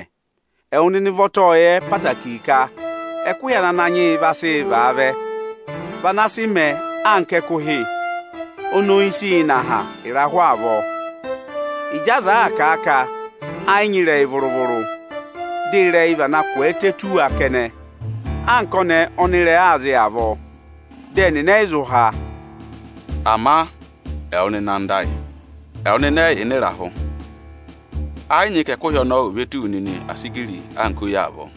Ipi 3.10Ẹwụ ụvọta ọ́ọ yẹ ẹtẹẹtẹrẹ ka ẹkụhị ana Ananyị yị vaa sị vaa vẹ vị ana sị mẹẹ anka ẹkụhị oni oyi sịị nọ aha ịrahụ avọọ. Ịjị aza àa kà a ka ẹ́ yị nyị ịrẹyị vụrụ-vụrụ, dị ịrẹyị vana ngụ tù wa kẹnẹ anka ọnẹẹ ọnị ịrẹẹ aa zị avọọ. Dị ẹnịnị ẹ́ yị zụ há. Ama ẹwụ nịnị anda ayị, ẹwụ nịnị ẹ́ yị yà ịnị ịrahụ. Ẹ yị nyị ka ẹkụhị ọnọọ ò ve tù wu nịnị asigiri anka oyi avọọ.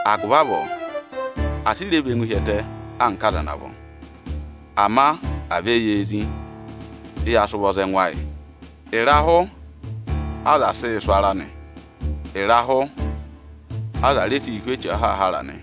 Agụvị avọọ, asị rẹ và ẹngụ hi ẹtẹ anka aza ana vọ. Ama à vẹ yee zí, dị ya sị ụvọ za ẹngụ ayị. Ịrahụ aza sịị̄ sụ̀ ara nị, ịrahụ aza re siī hú eche ahaahara nị.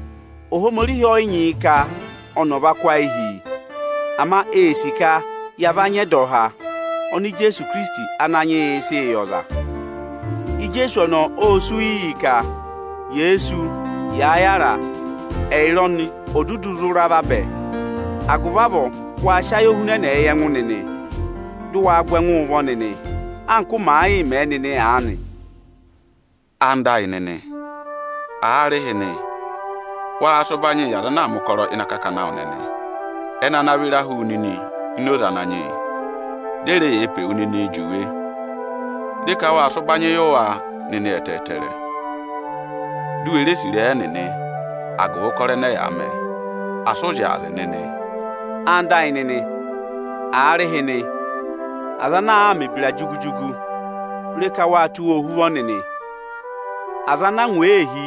Ohomorihi ọ yị nyị yị ka ọnị ọ̀ va kụ́ ayị hi yi. Ama ee sì ka ya va nyị ẹdọha ọnị Ijeesu sịị̄ yị ọza. Ijeesu ọnọọ ô sú yị ka, yèe sú yàa yára, ẹyịrị ọnị ò dudu zụ ra vabẹ. Agụvị avọọ, waa sị ayohunẹnẹẹ yị ẹngụ nịnị, dị ụ waa gụ ẹngụụ ụvọ nịnị, anka ụ màa yịị mẹ nịnị aanị. Ẹwụ nịnị ẹyịnyara amị, aarịhịnị, waa sị ụbanyị yị aza ana aa mẹ̀ ụkọrọ ịnị akakana awụ nịnị ẹnị ana vịra hu wu nịnị ini oze Ananyị yị, dị e re yee pe wu nịnịị juwe. Re ka waa sị ụbanyị yị wa nịnị ẹtẹẹtẹrẹ, di u we sì ịrẹyị ẹnịnị agụvị ụkọrọ ẹnẹ ẹyaa mẹ. Asị ụ zyaazị nịnị. Ẹwụ nịnị ẹyịnyara amị, aarịhịnị, aza ana aa mẹ̀ ebira jugu-jugu, re ka waa tụ́ wa ọhụva nịnị. Aza ana angwa ee hí,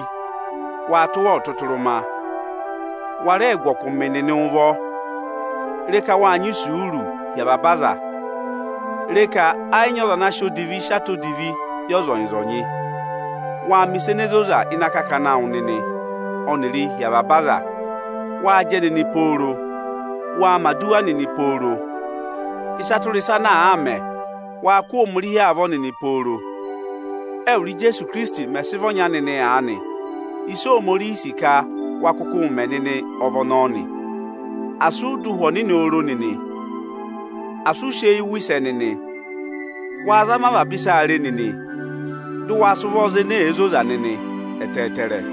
waa tụ́ wa ọtụtụrụma. Wa rẹẹ gụ ọkụmị nịnị ụvọ. Re ka waa nyị isuuru hi avaba aza. Re ka ẹ́ yị nyị ọza ana sị odivi si atọ odivi yị ọzọnyị-ọzọnyị. Waa mẹ̀ ịsa ene zoza ịnị akakana awụ nịnị, dị ụ wa rẹẹ mẹ̀ ẹ hi avaba ọza nịnị. Waa jẹ nịnị pooro. Waa mẹ̀ aduwa nịnị pooro. Ịsa tụra ịsa ana àaa mẹ, waa kụ́ Ohomorihi avọọ pooro. Ẹ́wụrị Ijeesu Ikirisiti mẹ̀ sị vị ọnya nịnị aanị, ịsị Ohomorihi sì ka wa kụkụụ mẹ nịnị ọ vị ọnọọ nị. Asị ụ dọ Ụhwẹ Ọnịnị oro nịnị. Asị ụ sị eyi wụ̀ ịrẹyị ẹnẹnị. Waa zama avaba ịsaa re nịnị, dị ụ wa sị ụvọ za ene zoza nịnị ẹtẹẹtẹrẹ.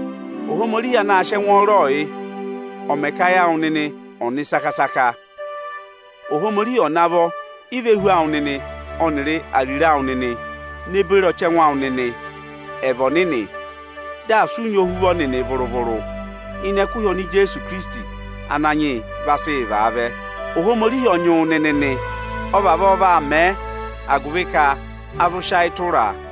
Ohomorihi anaā sịị ẹngwọọrọọ yị, ọ̀ mẹ ka ayị awụ nịnị ọ nị saka-saka. Ohomorihi ọ̀ navọ ivehu awụ nịnị ọnịrị ariro awụ nịnị ne beri ọchẹngụ awụ nịnị ẹ̀ vị ọnịnị; dị asị ụ nyị ohuvọ nịnị vụrụ-vụrụ ịnị ẹkụhị ọnị Ijeesu Ananyị yị vaa sị vaa vẹ. Ohomorihi ọ nyị wụ nịnị nị. Ọ vavọọ vaa mẹẹ agụvị ka a zụ sị ayị tụraa.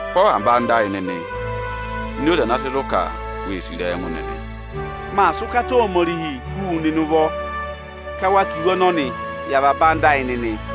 Kụ́ avaba anda ayị nịnị ini oze ana sị zụ ka wee sì ịrẹyị ẹngụ nịnị. Maa sị ụkata Ohomorihi hú nịnị ụvọ ka wa kà iwe ọnọnị yị avaba anda ayị nịnị.